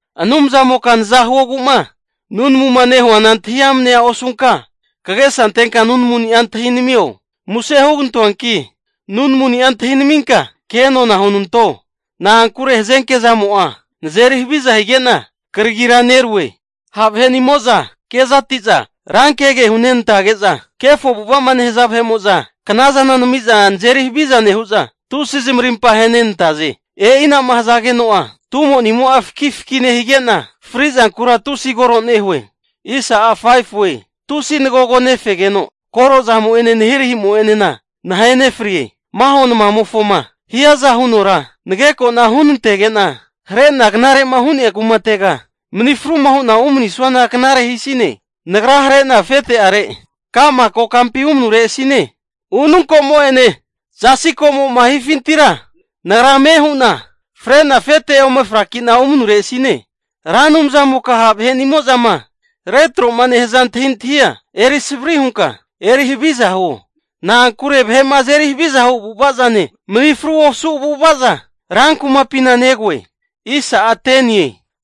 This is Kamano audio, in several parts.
Anumzamoka naza huogu'ma nunamuma nehuana antahi amnea osunka, kagesa antenka nunamuni'a antahinamio. Muse hugantoanki, nunamuni'a antahinaminka kenona hunanto. Na'ankure hazenke zamo'a nazeri haviza hige'na kragira nerue. Ha' vahe'nimo'za kezati'za rankege hunenantage'za, kefo avu'ava'ma nehaza vahe'mo'za knazana nami'za nazeri haviza nehu'za, tusi zamarimpa ahenenantaze. E'ina'ma hazageno'a tumonimo'a faki faki nehige'na, fri'zankura tusi koro nehue. Tusi nagogo nefegeno koro zamo'ene nahirahimo'enena nahenefrie. Maho namamofoma hiaza hunora nagekona huntenege'na, hare'na knare'ma hu'nea kumatega mani fruma hu'na umanuresina knare hisine. Nagra hare'na afete'are ka'ma kokampi umanuresine. Ununkomo'ene zasi komo'ma hifintira, nagra ame hu'na fre'na afete ome fraki'na umanuresine. Ra Anumzamoka ha' vahe'nimozama retroma nehaza antahintahia eri savri hunka eri haviza huo. Na'ankure vahe'ma azeri haviza hu avu'avazane, mani fru osu avu'avaza rankumapina negoe.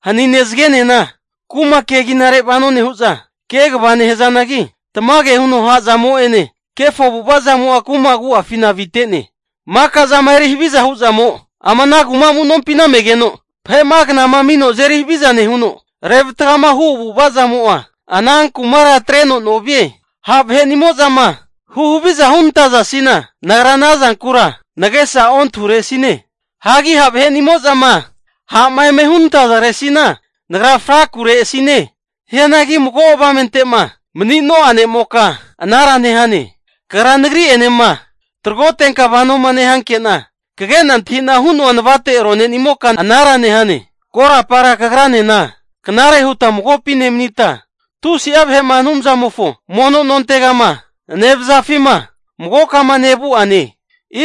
Hanine zagenena ku'ma keginare vano nehu'za kegava nehazanagi, tamage huno ha'zamo'ene kefo avu'ava zamo'a kuma agu'afina avite'ne. Maka zama eri haviza hu'zamo ama ana kuma amu'nompina megeno, vahe'ma knama amino azeri haviza nehuno, revatgama hu avu'avazamo'a ana kumara atreno novie. Ha' vahe'nimozama huhaviza hunantazasina, nagra ana zankura nagesa ontahuresine. Hagi ha' vahe'nimo'zama ha'ma eme hunantazaresina nagra frakuresine. Hianagi mago avamente'ma manino'a ne'moka anara nehane. Kagra nagri'enema tagrotenka vanoma nehankena, kagena antahina hu'noa navate ronenimoka anara nehane. Korapara kagranena knare huta magopi nemanita, tusi'a vahe'ma Anumzamofo mono nontegama nevazafima magokama nevu'ane.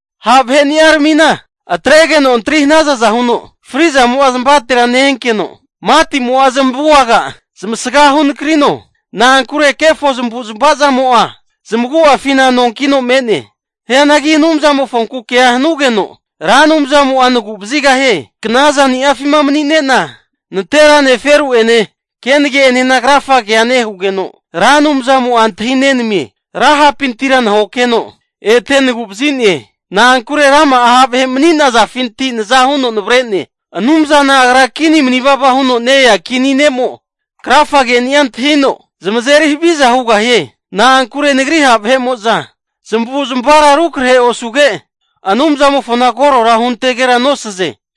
Ha' vahe'ni'aramina atregeno antri hanazaza huno fri'zamo'a zmavatera ne-enkeno, matimo'a zamavu aga zmasgahu nakarino. Na'ankure kefo zamavu'zmava zamo'a zamagu'afina nonkino me'ne. Hianagi Anumzamofonku kea hanugeno, Ra Anumzamo'a nagu'vazigahie. Knazani'afima mani'nena nanterane, feru'ene kenage'enena krafagea nehugeno, Ra Anumzamo'a antahi nenamie. Ra ha'pintira nahokeno ete nagu'vazine. Na'ankure rama'a ha' vahe maninazafinti naza huno navare'ne. Anumzana Agra kini mani vava huno ne-ea kini ne'mo krafage'ni'a antahino zamazeri haviza hugahie. Na'ankure nagri ha' vahe'mo'za zamavu'zmavara rukrahera osuge, Anumzamofona korora huntegera nosaze.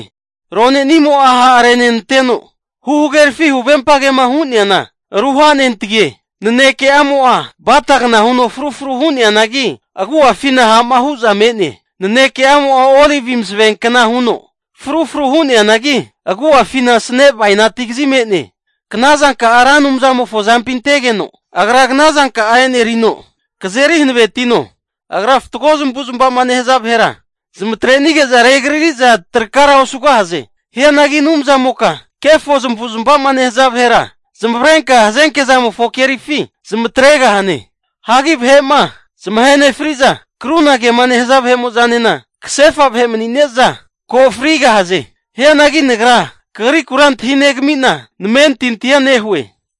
Ronenimo'a ha'renanteno huhagerafi huvempagema hu'neana ruhanentagie. Naneke'amo'a batagna huno frufru hu'neanagi, agu'afina ha'ma hu'za me'ne. Naneke'amo'a olivi masavenkna huno frufru hu'neanagi, agu'afina asane bainati kazi me'ne. Knazanka'a Ra Anumzamofo azampi antegeno, Agra knazanka'a e'nerino kazeri hanavetino. Agra fatgo zamavu'zmava'ma nehaza vahera zamatrenige'za regarari'za trakara osugahaze. Hianagi Anumzamoka kefo zamavu'zmava'ma nehaza vahera zamavarenka hazenke zamofo kerifi zamatregahane. Hagi vahe'ma zamahe nefri'za vahe'mo'zane krunagema nehaza vahe'mo'zanena kasefa vahe mani'ne'za ko frigahaze. Hianagi nagra Kagriku antahi negamina namentintia nehue.